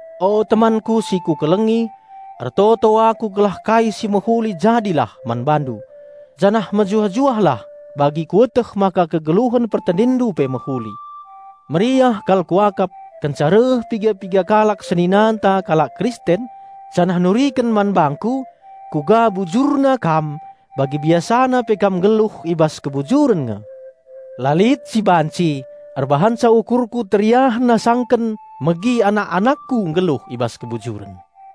O temanku si kukelengi, ertoto aku gelah kai si mehuli jadilah man bandu, janah mejuah-juahlah bagi kueteh maka kegeluhen pertendinndu pe mehuli. Meriah kal kuakap kenca reh piga-piga kalak seninanta kalak Kristen, janah nuriken man bangku uga bujurna kam bagi biasana pe kam nggeluh i bas kebujuren nge. La lit si banci erbahanca ukurku teriahen asangken megi anak-anakku nggeluh i bas kebujuren.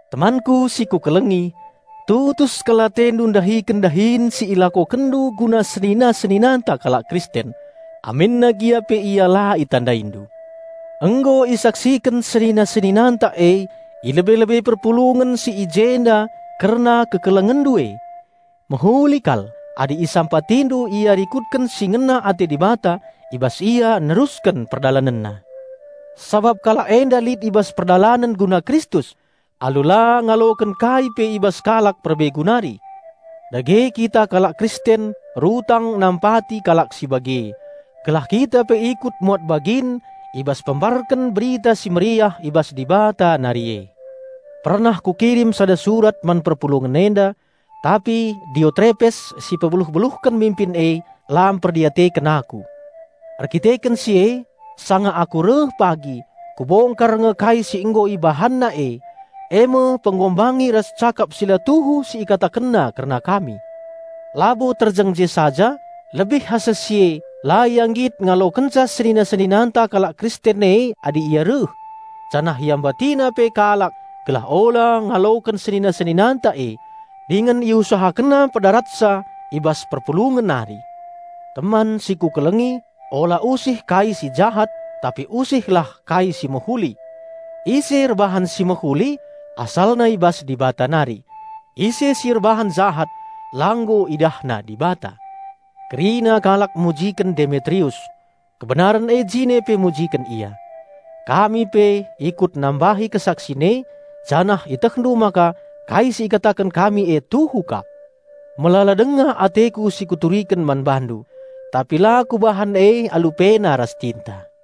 Temanku si kukelengi, tutus kal atendu ndahiken dahin si ilakokenndu guna senina-seninanta kalak Kristen, aminna gia pe ia la itandaindu. Nggo isaksiken senina-seninanta e i lebe-lebe perpulungen si i jenda kerna kekelengenndu e. Mehuli kal adi isampatindu ia rikutken si ngena ate Dibata i bas ia nerusken perdalanenna. Sabap kalak enda lit i bas perdalanen guna Kristus, alu la ngaloken kai pe i bas kalak perbegu nari. Dage kita kalak Kristen rutang nampati kalak si bage, gelah kita pe ikut muat bagin i bas pembarken Berita Si Mehuli i bas Dibata nari e. Pernah kukirim sada surat man perpulungen enda, tapi Diotrepes si pebeluh-beluhken minpin e, la mperdiateken aku. Erkiteken si e, sanga aku reh pagi ku bongkar nge kai si nggo ibahanna eme penghinan ras cakap si la tuhu si ikatakenna kerna kami. Labo terjeng je saja; lebih asa si e la ia nggit ngalokenca senina-seninanta kalak Kristen e adi ia reh, janah iambatina pe kalak gelah ula ngaloken senina-seninanta e, dingen iusahakenna pedaratsa i bas perpulungen nari! Teman si kukelengi, ula usih kai si jahat, tapi usihlah kai si mehuli. Ise erbahan si mehuli asalna i bas Dibata nari; ise si erbahan jahat la nggo idahna Dibata. Kerina kalak mujiken Demetrius; kebenaren e jine pe mujiken ia. Kami pe ikut nambahi kesaksin e, janah ietehndu maka kai si ikataken kami e tuhu kap. Melala denga ateku si kuturiken man bandu, tapi la kubahan e alu pena ras tinta.